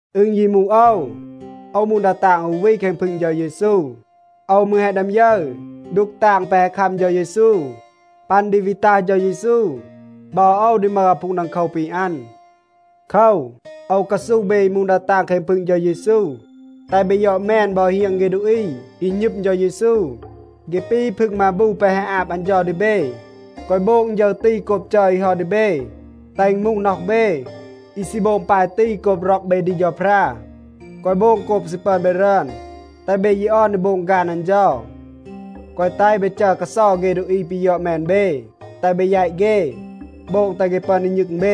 อึณ ยี มูห โอว, โอว มูห ดา ตาง อู วี แคง พึง เฌา เยซู. โอว มืร แฮะ ดึอม ยึร ดูก ตาง แปะ แฮะ คัม เฌา เยซู. ปัน ดี วี ตัห เฌา เยซู บอ โอว ดี มึห อาพูง ดังโคว ปี อัน. โคว, โอว กาซูห เบ อี มูห ดา ตาง แคง พึง เฌา เยซู, แตห เบ ยอด แมน บอ เฮียง เฆ ดูอี อี หณึม เฌา เยซู. เฆ ปี พึง มาบู แปะ แฮะ อาบ อัน เฌา ดี เบ. แกวะ โบง ฌึร ตี โกบ จัร อี เฮา ดี เบ. แตห อึณ มูห น็อห เบ, อี ซี โบง ปาย ตี โกบ ร็อก เบ ดี เฌาพรา. แกวะ โบง โกบ ซี ปึอน เบ รึอน. แตห เบ ยี ออน ดี โบง ฆาน อัน เฌา. แกวะ แตห เบ จัร กาเซา เฆ ดูอี ปี ยอด แมน เบ. แตห เบ แยต เฆ, โบง แตห เฆ ปึอน ดี ณึง เบ.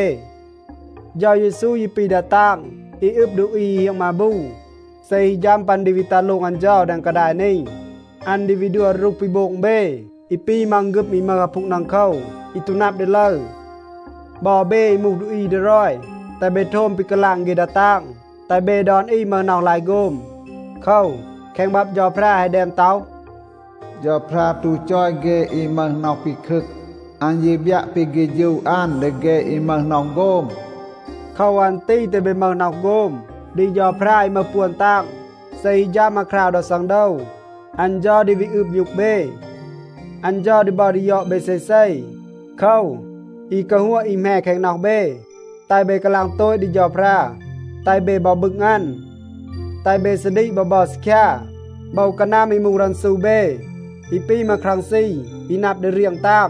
เฌา เยซู ยี ปี ดา ตาง อี อึบ ดูอี อี เฮียง มาบู. เซ ฮี ฌัม ปัน ดี วี ตัห โลง อัน เฌา แดง กาดาย นี, อัน ดี วี ดัว รูห ปี โบง เบ อี ปี มังฆึม อี มึห อาพูง ดังโคว อี ตู นับ ดี ลึร. บอ เบ อี มูห ดูอี ดีรอย, แตห เบ โทม ปี กาลาง เฆ ดา ตาง. แตห เบ ดอน อี มึห น็อห ลาย โฆม. โคว, แคง บับ เฌาพรา แฮะ แดม ต็อห, “เฌาพรา ตู จอย เฆ อี มึห น็อห ปีคึก. อัน ยี บยัะ ปี เฆฌู อัน ดี เฆ อี มึห น็อห โฆม.” โคว อัน ตี แตห เบ มึห น็อห โฆม ดี เฌาพรา อี มึห ปวน ตาง. เซ ฮี ฌัม อาคราว ดอ ซังโดว, อัน เฌา ดี วี อืบ มยูก เบ. อัน เฌา ดี บัร ดี ยอด เบ เซเซ. โคว, อี กาฮัวะ อี แหม แคง น็อห เบ, แตห เบ กาลาง โตต ดี เฌาพรา. แตห เบ บอ บึง อัน. แตห เบ ซาดีก บอ บัร ซีคยา. โบว กานัม อี มูห รันซู เบ อี ปี มาครังซี อี นับ ดี เรียง ตาง,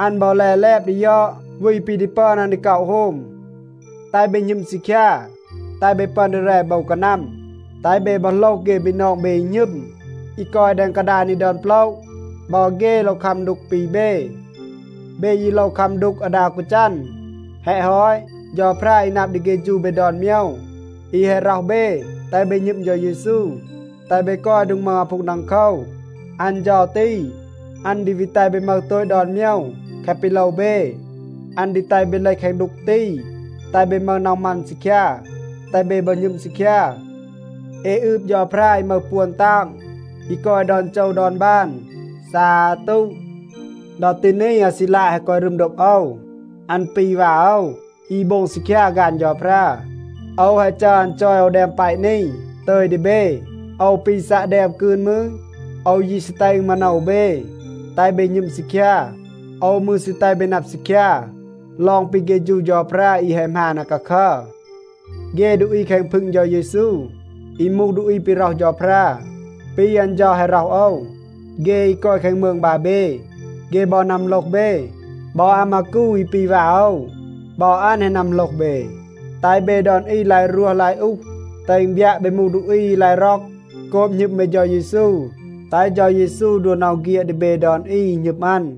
อัน บอ แล แลบ ดี ยอด วี ปี ดี ปึอน อัน ดี ก็อะ โฮม. แตห เบ หณึม ซีคยา, แตห เบ ปึอน ดี แร โบว กานัม. แตห เบ บอ โหลห เฆ บีนอง เบ อี หณึม, อี กอย แดง กาดาย นี ดอน โปละ. บอ เฆ โลว คัม ดูก ปี เบ. เบ ยี โลว คัม ดูก อาดา อู กาจัน. แฮะ ฮอต, เฌาพรา อี นับ ดี เฆฌู เบ ดอน โมยว, อี แฮะ ร็อห เบ แตห เบ หณึม เฌา เยซู, แตห เบ กอย โดง มึห อาพูง ดังโคว, อัน เฌา ตี, อัน ดี วี แตห เบ มึห โตต ดอน โมยว แคะ ปี โลว เบ. อัน ดี แตห เบ เลห แคง ดูก ตี, แตห เบ มึห น็อห มัน ซีคยา, แตห เบ บอ หณึม ซีคยา. เอ อืบ เฌาพรา อี มึห ปวน ตาง, อี กอย ดอน โจว ดอน บาน. ซาตู. ดอ ตี นี, อาซีลาด แฮะ กอย รึม โดบ โอว. อัน ปี วา โอว อี โบง ซีคยา ฆาน เฌาพรา. โอว แฮะ จัร อัน จอย โอว แดม แปะ นี ตึย ดี เบ. โอว ปี ซัะ แดม กืน มืร, โอว ยี ซี แตห อึณ มาโนว เบ, แตห เบ หณึม ซีคยา. โอว มืร ซี แตห เบ นับ ซีคยา ลอง ปี เฆฌู เฌาพรา อี แฮะ หมาน อาคาคัร. เฆ ดูอี แคง พึง เฌา เยซู อี มูห ดูอี ปี ร็อห เฌาพรา ปี อัน เฌา แฮะ ร็อห โอว, เฆ อี กอย แคง มืง บาแบ, เฆ บอ นัมโหลห เบ. บอ อามากู อี ปี วา โอว, บอ อัน แฮะ นัมโหลห เบ. แตห เบ ดอน อี ลาย รวห ลาย อูห, แตห อึณ บยัะ เบ มูห ดูอี อี ลาย ร็อก โกบ หณึม เบ เฌา เยซู. แตห เฌา เยซู ดัว น็อห เฆียด ดี เบ ดอน อี, อี หณึม อัน.